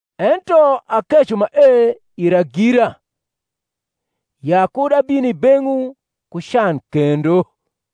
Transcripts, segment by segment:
Ento akeco mae ira gira, ya kud abin i beng’wu ku can kendo.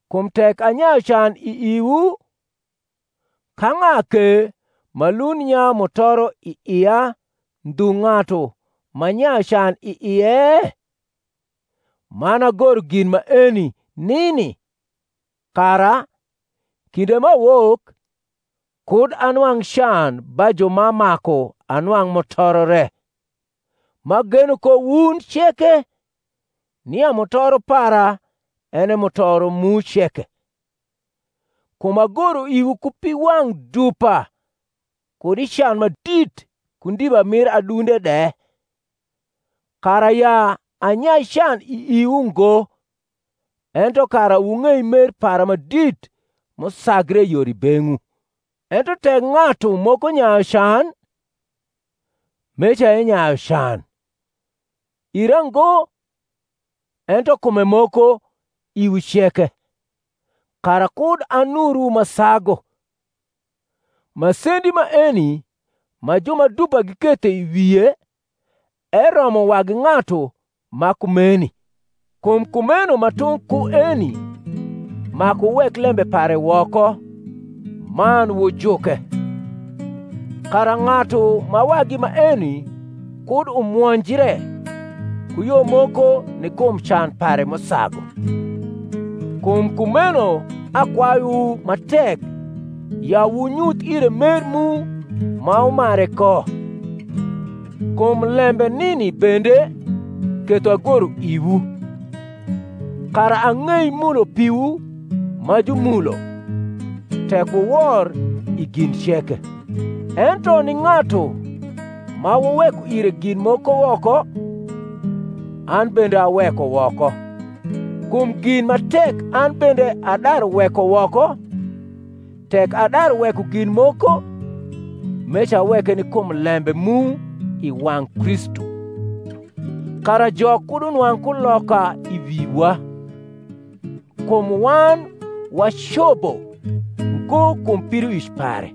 Kum tek anyayu can i iwu, ka ng’a ke ma lund nyayu mutoro i ia ndhu ng’atu m’anyayu can i ie? Man agoro gin maeni nini, kara, kinde m’awok, kud anwang’ can ba ju ma maku anwang’ mutoro re; m’ageno ko wun ceke, nia mutoro para en e mutoro mu ceke. Kum agoro iwu ku piwang’ dupa kud i can ma dit ku ndiba mir adunde de; kara ya anyai can i iwu ngo, ento kara wung’ei mer para ma dit m’usagre yor i beng’wu. Ento tek ng’atu moko nyayu can, meca enyayu can, ira ngo, ento kume moko iwu ceke (kara kud anurwu ma sagu). Masendi maeni ma ju ma dupa giketho i wie eromo wagi ng’atu ma kumeni; kum kumeno ma tung’ ku eni maku wuwek lembe pare woko man wujuke, kara ng’atu ma wagi maeni kud umwonjre ku yo moko ni kum can pare m’usagu. Kum kumeno akwayuwu ma tek ya wunyuth ire mer mu ma wumare ko. Kum lembe nini bende ketho agoro iwu, kara ang’ei mulo piwu ma jumulo, tek wuwor i gin ceke. Ento ni ng’atu ma wuweko ire gin moko woko, an bende aweko woko: kum gin ma tek an bende adaru weko woko, tek adaru weko gin moko, meca aweke ni kum lembe mu i wang’ Kristu; kara Jok kud unwang’ kuloka i wiwa: kum wan wacobo ngo kum pidoic pare.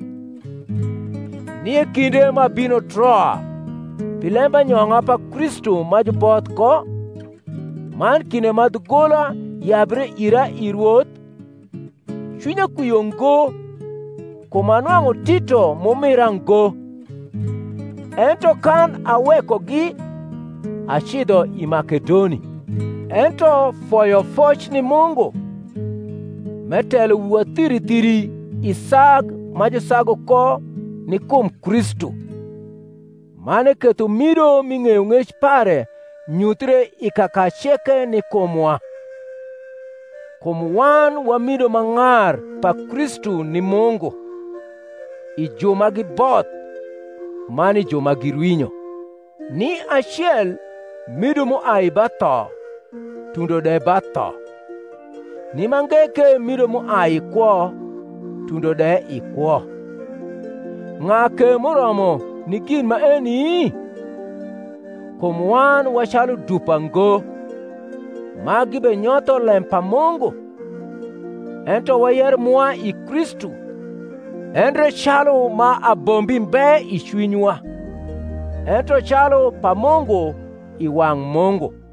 Nie kinde m’abino Troa pi lembanyong’a pa Kristu ma juboth ko, man kinde ma dhugola yabre ira i Rwoth, cwinya kwio ngo, kum anwang’u Tito m’umira ngo: ento kan awekogi, acidho i Makedoni. Ento foyofoc ni Mungu, m’etelo wiwa thiri thiri i sag ma jusagu ko ni kum Kristu, man eketho mido mi ng’eyong’ec pare nyuthie i kaka ceke ni kumwa. Kum wan wa mido ma ng’ar pa Kristu ni Mungu, i ju ma giboth, man i ju ma girwinyo; ni acel mido m’uai ba tho tundo de ba tho; ni mange ke mido m’uai i kwo tundo de i kwo. Ng’a ke m’uromo ni gin maeni? Kum wan wa calu dupa ngo, ma gibenyotho lem pa Mungu: ento wayero mwa i Kristu, endre calu ma abombi mbe i cwinywa, ento calu pa Mungu i wang’ Mungu.